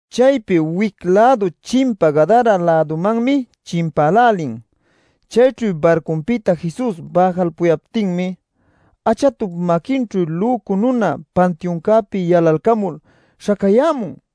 Chaypi wic-lädu chimpa Gadara-lädumanmi chimpälälin. Chayćhu barcupïta Jesus bäjalpuyaptinmi achatup maquinćhu lücu nuna pantiuncäpi yalalcamul śhacayämun.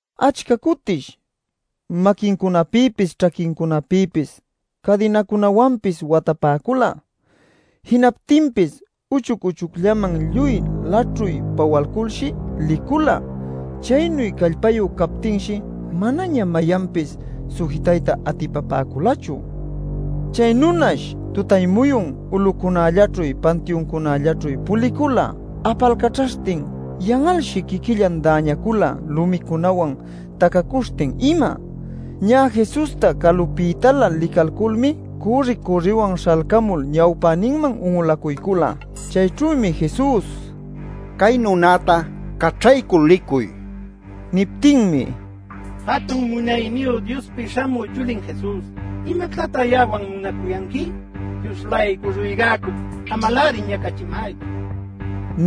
Achca cutish maquincunapïpis, ćhaquincunapïpis cadinacunawanpis watapäcula. Jinaptinpis uchuc-uchucllaman lluy laćhuy pawalculshi licula. Chaynu callpayu captinshi manaña mayanpis sujitayta atipapäculachu. Chay nunash tutay-muyun ulucunallaćhu, pantiuncunällaćhu pulicula apalcaćhaśhtin. Yan'alshi quiquillan däñacula lumicunawan tacacuśhtin ima. Ñä Jesusta calupïtalä licalculmi cürri-cürriwan śhalcamul ñawpäninman un'ulacuycula. Chayćhümi Jesus: “Cay nunäta caćhaycul licuy” nila. Niptinmi: “Jatun Munayniyu Diospi Śhamü Chulin Jesus, ¿imactatá ya'awan munacuyanqui? Dios-laycu ruygacuc, amaläri ñacachimaychu” nin.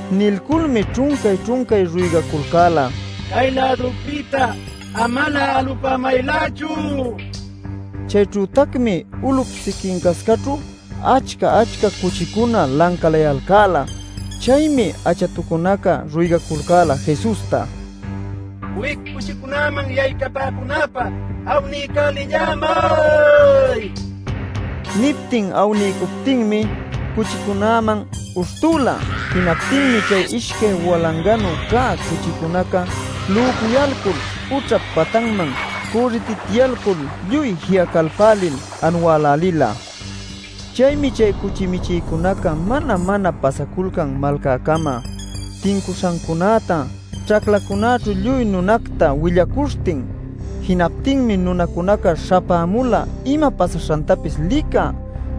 Nilculmi ćhuncay-ćhuncay ruygaculcäla “¡Cay-lädupïta amalä alupämaylächu!” nil. Chayćhütacmi ulup siquincascaćhu achca-achca cuchicuna lancalayalcäla. Chaymi achatucunaca ruygacula Jesusta: “Wic cuchicunäman yaycapäcunäpä awniycälillämay” nil. Niptin awniycuptinmi cuchicunäman uśhtüla. Jinaptinmi chay ishcay walanganu cä cuchicunaca lücuyalcul ućhap patanman cürritityalcul lluy ji'acalpälil anuälälila. Chaymi chay cuchi michïcunaca mana-mana pasaculcan malcäcama tincuśhancunäta ćhaclacunäćhu lluy nunacta willacuśhtin. Jinaptinmi nunacunaca śhapämula ima pasaśhantapis licä.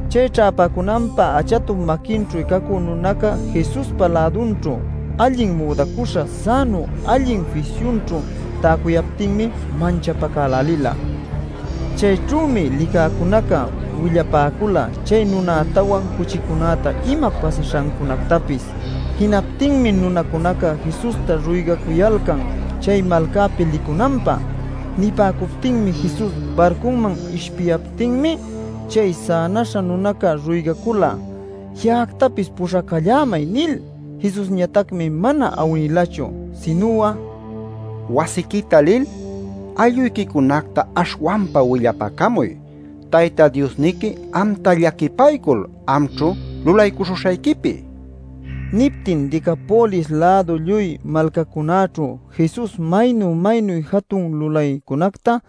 Chay ćhäpäcunanpä achatup maquinćhu cacü nunaca Jesuspa lädunćhu, allin müdacuśha, sänu allin fisyunćhu täcuyaptinmi manchapacälälila. Chayćhümi licäcunaca willapäcula, chay nunätawan cuchicunäta ima pasaśhancunactapis. Jinaptinmi nunacunaca Jesusta ruygacuyalcan chay malcapi licunanpä. Nipäcuptin Jesus barcuman ishpiyaptinmi chay sänaśha nunaca ruygacula: “Ya'actapis puśhacallämay” nil. Jesusñatacmi mana awnilachu, sinu'a: “Wasiquita lil aylluyquicunacta aśhwanpa willapacamuy Tayta Diosniqui amta llaquipaycul amćhu lulaycuśhuśhayquipi” nila. Niptin Decapolis-lädu lluy malcacunäćhu Jesus maynu maynu jatun lulaycunacta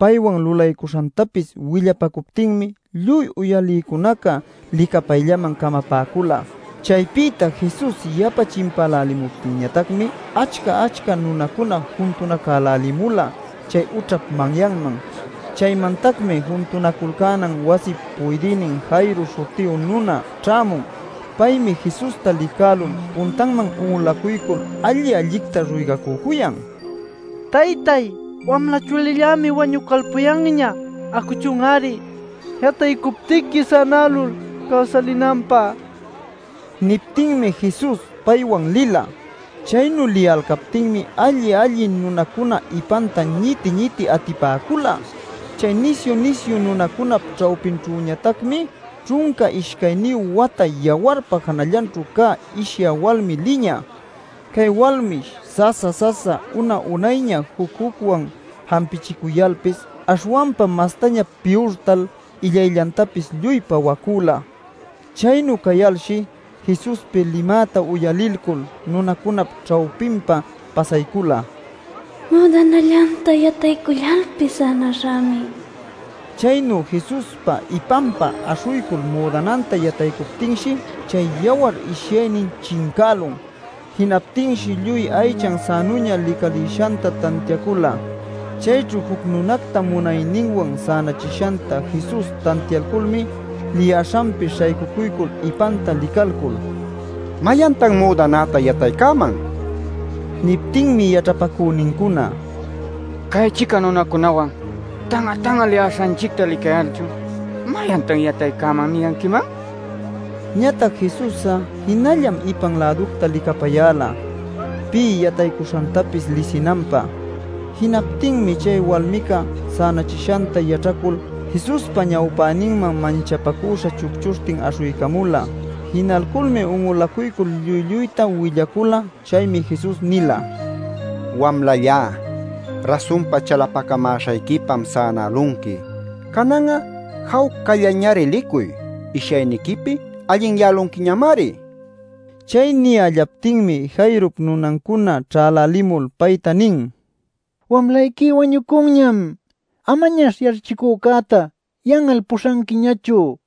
paywan lulaycuśhantapis willapacuptinmi lluy uyalïcunaca licapayllaman camapäcula. Chaypïta Jesus yapa chimpäläliptinñatacmi achca-achca nunacuna juntunacälälimula chay ućhap manyanman. Chaymantacmi juntunaculcänan wasip puydïnin Jairo śhutiyu nuna ćhämun. Paymi Jesusta licälul puntanman un'ulacuycul alli-allicta ruygacücuyan: “Taytay, wamla chulillämi wañucalpuyanña. Acuchun-ari yataycuptiqui sänälul cawsalinanpä” nil. Niptinmi Jesus paywan lila. Chaynu liyalcaptinmi alli-alli nunacuna ipanta ñiti-ñiti atipäcula. Chay nisyu-nisyu nunacunap ćhawpinćhüñatacmi ćhunca ishcayniyu wata yawarpa janallanćhu cä ishyä walmi liñä. Cay walmish sasa-sasa una-unayña juc-jucwan jampichicuyalpis aśhwanpa mastaña piyurtal illayllantapis lluy pawapacüla. Chaynu cayalshi Jesuspi limäta uyalilcul nunacunap ćhawpinpa pasaycula “Müdanallanta yataycullalpis sänaśhämi” nil pinsaśhtin. Chaynu Jesuspa ipanpa aśhuycul müdananta yataycuptinshi chay yawar ishyaynin chincälun. Jinaptinshi lluy aychan sänuña licalïshanta tantiacula. Chayćhu juc nunacta munayninwan sänachishanta Jesus tantialculmi liyäśhanpi śhaycuycul ipanta licalcul: “¿Mayantan müdanäta yataycäman?” nin. Niptinmi yaćhapacünincuna: “Cay-chica nunacunawan tan'a-tan'a liyäśhanchicta licayalchun ‘¿Mayantan yataycäman?’ niyanquiman” nipäcula. Ñatac Jesus'a jinallam ipan-läducta licapayäla pï yataycuśhantapis lisinanpä. Jinaptinmi chay walmica, sänachishanta yaćhacul, Jesuspa ñawpäninman manchapacüśha chucchuśhtin aśhuycamula. Jinalculmi un'ulacuycul lluy lluyta willacula. Chaymi Jesus nila: “Wamlallá, rasunpa chalapacamäśhayquipam sänälunqui. Canan'a jawcallañari licuy. Ishyayniquipi allinyälunquiñamari” nil. Chay niyällaptinmi Jairop nunancuna ćhälälimul payta nin: “Wamlayqui wañucunñam. Amañash yaćhachicücäta yan'al puśhanquiñachu” nil.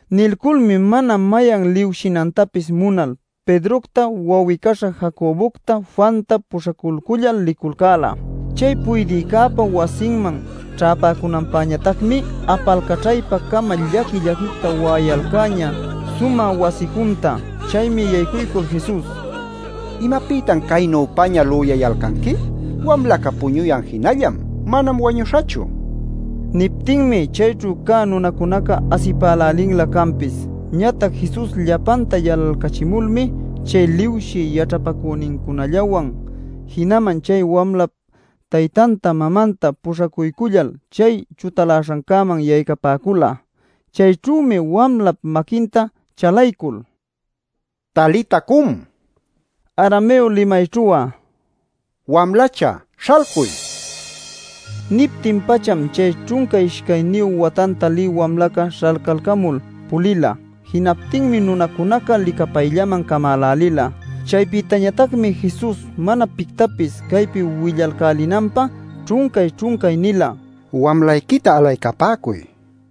Nilculmi mana mayan liwshinantapis munal Pedrocta, wawi-caśha Jacobocta, Juanta puśhaculcullal liculcäla. Chay puydïcäpa wasinman ćhäpäcunanpäñatacmi apalcaćhaypa-cama llaqui-llaquicta wa'ayalcäñä sumä wasi junta. Chaymi yaycuycul Jesus: “¿Imapïtatan caynüpaña lüyayalcanqui? Wamlaca puñuyan jinallam; manam wañuśhachu” nin. Niptinmi chayćhu cä nunacunaca asipälälinlä canpis. Ñatac Jesus llapanta yalalcachimulmi chay liwshï yaćhapacünincunallawan jinaman chay wamlap taytanta mamanta puśhaculcullal chay chutaläśhancäman yaycapäcula. Chayćhümi wamlap maquinta chalaycul: “Talita cum” nila. (Arameo limayćhu'a “Wamlacha, śhalcuy” ninanmi.) Niptin-pacham chay ćhunca ishcayniyu watanta lï wamlaca śhalcalcamul pulila. Jinaptinmi nunacunaca licapayllaman camälälila. Chaypïñatacmi Jesus mana pictapis caypi willalcälinanpä ćhuncay-ćhuncay nila: “Wamlayquita alaycapäcuy” nil.